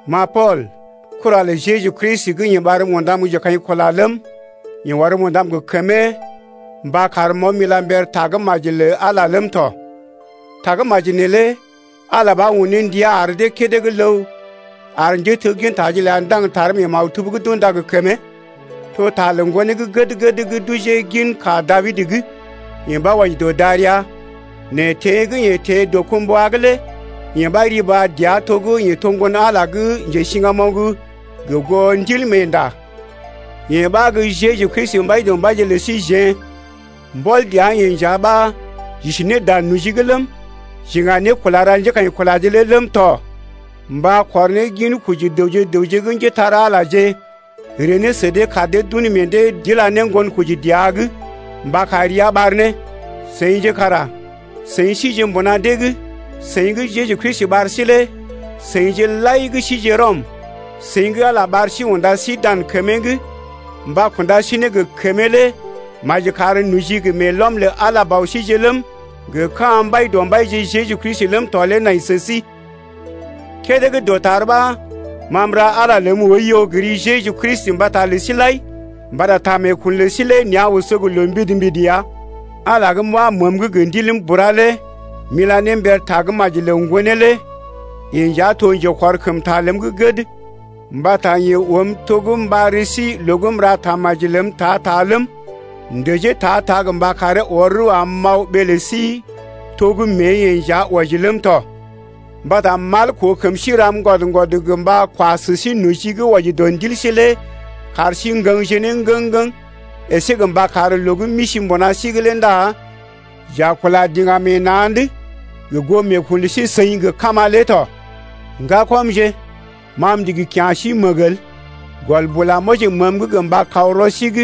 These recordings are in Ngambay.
Ma Pool, kura lə Jeju Kristi, gə́ Ala ɓarm undam gə́ njekaḭkula ləm, yeḛ ɔrm undam gə kəmee mba karm m’aw m’ila mber Tagə́maji lə Ala lé ləm tɔ. Tagə́maji neelé Ala ɓa un ne ndia ar dee kédé gə́ ləw ar njéteggintaje ləa ndaŋg taree mee maktub gə́ d’unda gə kəmee. To ta lə Ŋgonee gə́ gəd-gəd gə́ d’ojee ginka Dabid’g, yeḛ ɓa wɔji dɔ darəa, nɛ teḛ gə́ yeḛ teḛ dɔkumbwa’g lé yee ɓa riba dəa to gə́ yeḛ to Ŋgon-Ala gə́ njesiŋgamoŋ gə goo Ndilmeenda. Yee ɓa gə́ Jeju Kristi Mbaidɔmbaije lə síjeḛ. Mbɔl dəa-yeḛ nja ɓa j’isi ne dan noji’g ləm, j’iŋga ne kula ra njékaḭkulaje lé ləm tɔ mba kɔr ne ginkoji dəwje gə raŋg gə́ njépole-magəje ree ne sə dee kar dee d’un ne meḛ dee d’ila ne ŋgonkoji dəa’g mba kar ria ɓar ne. Seḭje kara seḭ sije mbuna dee’g, seḭ gə́ Jeju Kristi ɓar sí lé. Seḭje lai gə́ sije Rɔm, seḭ gə́ Ala ɓar sí unda sí dan kəmee’g gə mba kunda sí gə kəmee lé maji kar noji gə meelɔm lə Ala Bɔ síje ləm, gə ka̰ Mbaidɔmbaije Jeju Kristi ləm tɔ lé nai sə sí. Kédé gə́ dɔtar ɓa ma m’ra Ala ləm oiyo gə ri Jeju Kristi mbata lə sí lai mbata ta meekun lə sí lé nea̰ oso gə loo mbidi-mbidi ya. Ala gə́ m’wa məəm’g gə ndiləm bura lé m’ila ne mber Tagə́maji lə Ŋgonee lé yeḛ nja to gə́ njekɔrkəmta ləm gə́ gəd mbata yeḛ oom to gə́ m’ɓar ri sí loo gə́ m’ra tamaji ləm ta-ta ləm, m’ndəjee ta-ta gə mba karee ɔr rəw am m’aw ɓee lə sí to gə́ mée-yeḛ nja wɔji ləm tɔ. Mbata mal koo kəm sí ram ŋgwɔd-ŋgwɔd gə mba kwa sə sí noji gə́ wɔji dɔ ndil sí lé kar sí ŋgəŋje ne ŋgəŋ-ŋgəŋ, əsé mba kar loo gə́ m’isi mbuna sí’g lé ndá j’a kula diŋgam meḛ na̰’d gə goo meekun lə sí-seḭ gə kama lé tɔ. Ŋgakɔmje, ma m’ndigi kya̰ sí məg el, gɔl bula m’wɔji məəm’g gə mba kaw rɔ sí’g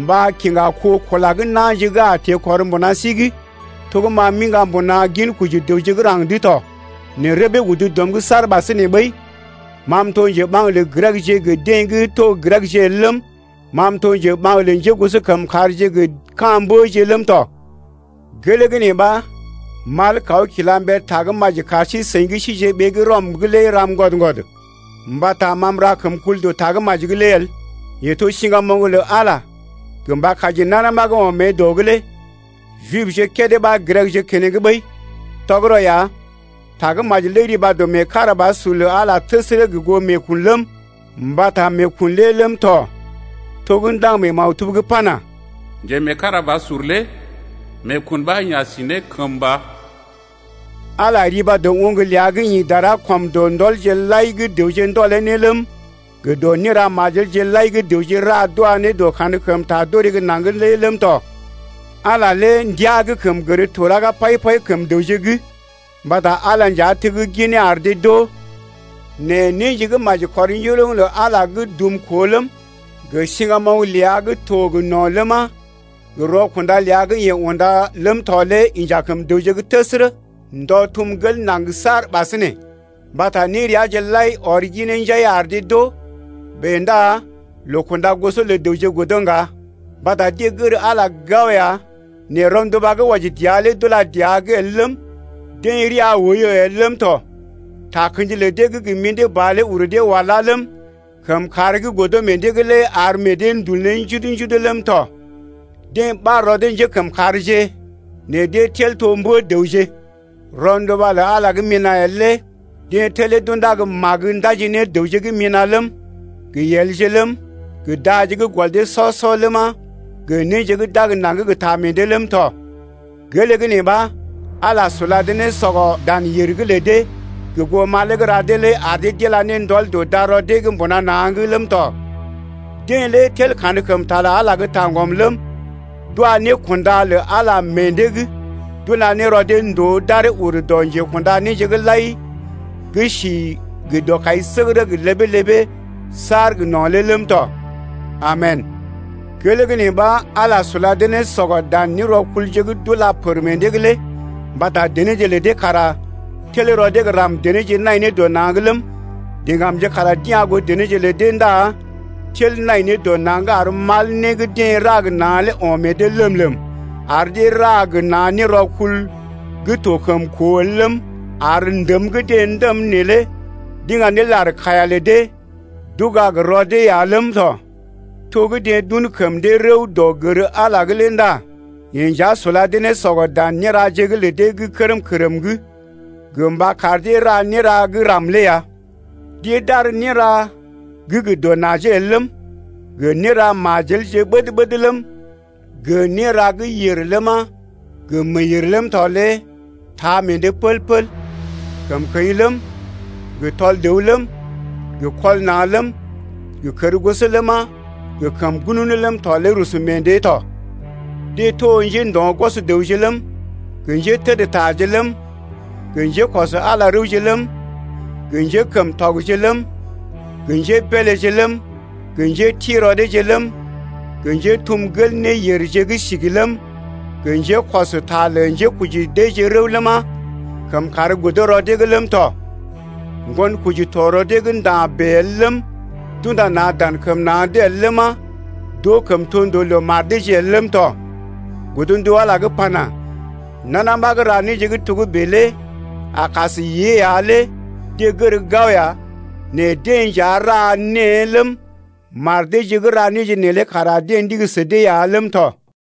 mba kiŋga kó kula gə́ na̰je gə́ a teḛkɔr mbuna sí’g, to gə́ ma m’iŋga mbuna ginkoji dəwje gə́ raŋg’d tɔ, nɛ rəbee udu dɔm’g saar ɓasinè ɓəi. Ma m’to njeɓaŋ lə Grekje gə deḛ gə́ to Grekje el ləm, ma m’to njeɓaŋ lə njégosokəmkàrje gə ka̰ mbəje ləm tɔ. Gelee gə́ nee ɓa mal kaw kila mber Tagə́maji kar sí-seḭ gə́ síje ɓee gə́ Rɔm’g lé ram ŋgwɔd-ŋgwɔd ya. Mbata m’ra kəmkul dɔ Tagə́maji’g lé el: yee to siŋgamoŋ lə Ala gə mba kaji nana ɓa gə́ ɔm mée dɔ’g lé Jibje kédé ɓa Grekje keneŋ ɓəi. Tɔgərɔ ya Tagə́maji lé riba dɔ meekarabasur lə Ala lé təsərə gə goo meekun ləm, mbata meekun lé ləm tɔ to gə́ ndaŋg mee maktub’g pana: Njemeekarabasur lé meekun ɓa yeḛ a si ne kəmba ya. Ala riba dɔ oŋg ləa gə́ ḭ dara ɔm dɔ ndɔlje lai gə́ dəwje ndɔlee ne ləm, gə dɔ néra majelje lai gə́ dəwje ra d’wa ne dɔ kankəmta d’orè gə́ naŋg lé ləm tɔ. Ala lé ndiaa gə́ kəm gər to raga pai-pai kəm dəwje’g mbata Ala lé nja tegginee ar dee d’oo. Nɛ néje gə́ maji kɔr njoroŋ lə Ala gə́ dumkoo ləm, gə siŋgamoŋ ləa gə́ to gə no̰ ləma, gə rɔkunda ləa gə́ yeḛ unda ləm tɔ lé inja kəm dəwje’g təsərə, ndɔ tum gel naŋg saar ɓasinè, mbata néreaje lai ɔr ginee njai ar dee d’oo. Bèe ndá loo kunda goso lə dəwje godo ŋga, mbata deḛ gər Ala lé gao ya nɛ rɔnduba gə́ wɔji dəa lé d’ula dəa’g el ləm, deḛ rəa oiyo el ləm tɔ. Takə̰ji lə deḛ gə́ gə mḭdé ba lé uru dee wala ləm, kəmkàr gə́ godo meḛ dee’g lé ar meḛ dee ndul ne njudu-njudu ləm tɔ. Deḛ ɓar rɔ dee njékəmkàrje nɛ deḛ tel to mbə-dəwje. Rɔnduba lə Ala gə́ mina̰ el lé deḛ telee d’unda gə́ magə ndaji ne dəwje gə́ mina̰ ləm, gə yelje ləm, gə daje gə́ gɔl dee sɔ-sɔ ləma, gə néje gə́ d’ag naŋg gə ta meḛ dee ləm tɔ. Gelee gə́ nee ɓa Ala sula dee ne sɔgɔ dan yèr’g lə dee gə goo malee gə́ ra dee lé ar dee d’ila ne ndɔl dɔ darɔ dee’g mbuna na̰’g ləm tɔ. Deḛ lé tel kankəmta lə Ala lé gə́ taŋgɔm ləm, d’wa nékunda lə Ala meḛ dee’g d’ula ne rɔ dee ndòo d’aree ur dɔ Njekunda néje lai gə́ si gə dɔkaisəgərə gə ləbee-ləbee saar gə no̰ lé ləm tɔ. Amen. Gelee gə́ nee ɓa Ala sula dee ne sɔgɔ dan nérɔkulje gə́ d’ula pər meḛ dee’g lé, mbata denéje lə dee kara tel rɔ dee gə́ ram-denéje nai ne dɔ na̰’g ləm, diŋgamje kara d’ya̰ goo denéje lə dee ndá tel nai ne dɔ na̰’g ar mal né gə́ deḛ ra gə na̰ lé o̰ meḛ dee lèm-lèm, ar dee ra gə na̰ nérɔkul gə́ to kəm koo el ləm, ar ndəm gə́ deḛ ndəm neelé d’iŋga ne lar-kaiya lə dee, d’uga gə rɔ dee ya ləm tɔ. To gə́ deḛ d’un ne kəm dee rəw dɔ gər Ala’g lé ndá yeḛ nja sula dee ne sɔgɔ dan néraje’g lə dee gə́ kərm-kərm’g gə mba kar dee ra néra gə́ ram lé ya. Deḛ d’ar néra gə dɔ najee el ləm, gə néra majelje ɓəd-ɓəd ləm, gə néra gə́ yèr ləma, gə meeyèr ləm tɔ lé taa meḛ dee pəl-pəl. Kəmkəḭ ləm, gə tɔl dəw ləm, gə kɔl na̰ ləm, gə kərgoso ləma, gə kəm ŋgununu ləm tɔ lé rusu meḛ dee tɔ. Deḛ to njéndo̰-gwɔs dəwje ləm, gə njétədtaje ləm, gə njékɔs Ala rəwje ləm, gə njékəmtɔgje ləm, gə njébeeleje ləm, gə njéti rɔ deeje ləm, gə njétum gel néyèrje gə́ sigi ləm, gə njékɔs ta lə njekoji deeje rəw ləma, kəmkàr godo rɔ dee’g ləm tɔ. Ŋgonkoji to rɔ dee’g nda̰ bèe el ləm, d’unda na̰ dan kəm na̰’d el ləma, d’oo kəmtondoo lə mar deeje el ləm tɔ. Godndu Ala gə́ pana: Nana ɓa gə́ ra néje gə́ togə́bè lé a kas yée ya lé deḛ gər gao ya nɛ deḛ nja ra née ləm, mar deeje gə́ ra néje neelé kara deḛ ndigi sə dee ya ləm tɔ.